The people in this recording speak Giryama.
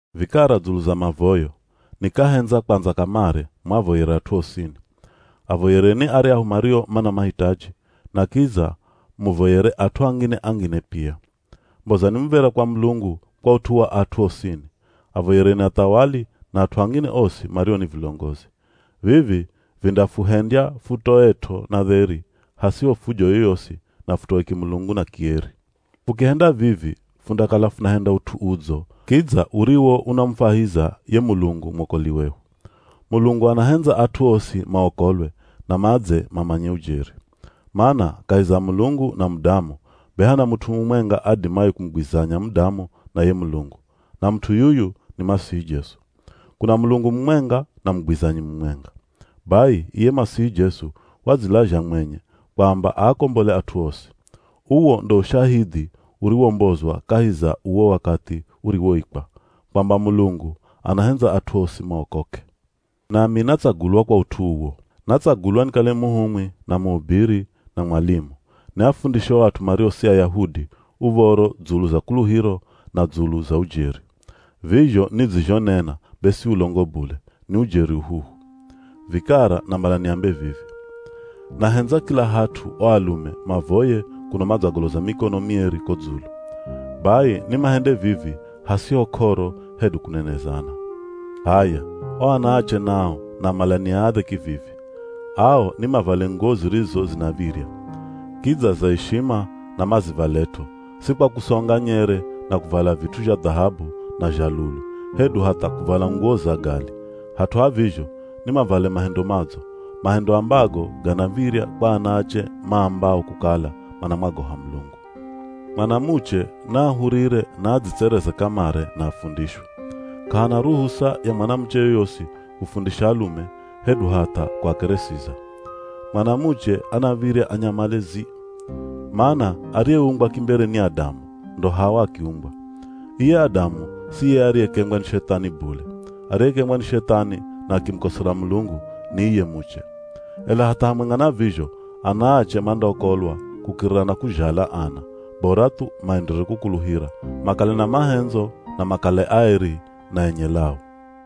Vikara dzulu za mavoyo, nikahendza kwandza kamare muavoyere at'u osini. Avoyereni aryahu mario mana mahitaji, na kidza muvoyere at'u angine-angine pia. Mbozani muv̱era kwa Mulungu kwa ut'u wa at'u osini, Avoyereni athawali na at'u angine osi mario ni vilongozi. Vivi vindafuhendya futoet'o na dheri, hasiho fujo yoyosi na futoe kimulungu na kieri. Fukihenda vivi, fundakala funahenda ut'u udzo kidza uriwo unamufwahiza ye Mulungu mwokoli wehu. Mulungu anahendza at'u osi maokolwe na madze mamanye ujeri. Mana kahi za Mulungu na mudamu, be hana mut'u mumwenga adimaye kumugwizanya mudamu na ye Mulungu, na mut'u yuyu ni Masihi Jesu. Kuna Mulungu mumwenga na mugwizanyi mumwenga. Bai iye Masihi Jesu wadzilazha mwenye kwamba aakombole at'u osi. Uwo ndo ushahidhi uriwombozwa kahi za uwo wakathi uriwoikwa, kwamba Mulungu anahendza at'u osi maokoke. Nami natsagulwa kwa ut'u uwo. Natsagulwa nikale muhumwi na muhubiri na mwalimu, niafundishe o at'u mario si Ayahudi uv̱oro dzulu za kuluhiro na dzulu za ujeri. (Vizho nidzizhonena be si ulongo bule, ni ujeri uhuhu.) Vikara namala niambe vivi, nahendza kila hat'u o alume mavoye kuno madzagoloza mikono mieri ko dzulu. Bai ni mahende vivi hasiho k'oro hedu kunenezana. H'aya o anaache nao namala niaadhe kivivi, ao ni mavale nguwo zirizo zinav̱irya. Kidza za ishima na mazivalet'o, si kwa kusonga nyere na kuvala vit'u zha dhahabu na zha lulu, hedu hatha kuvala nguwo za gali, hat'u ha vizho, ni mavale mahendo madzo, mahendo ambago ganav̱irya kwa anaache maambao kukala manamwagoha Mulungu. Mwanamuche na ahurire na adzitsereze kamare na afundishwe. K'ahana ruhusa ya mwanamuche yoyosi kufundisha alume hedu hatha kuakeresiza. Mwanamuche anav̱irya anyamale zii. Mana ariyeumbwa kimbere ni Adamu, ndo Hawa akiumbwa. Iye Adamu siye ariyekengwa ni Shethani bule, ariyekengwa ni Shethani na akimukosera Mulungu ni iye muche. Ela hatha hamwenga na vizho anaache mandaokolwa kukirira na kuzhala ana, bora thu maenderere kukuluhira, makale na mahendzo na makale aeri na enye lau.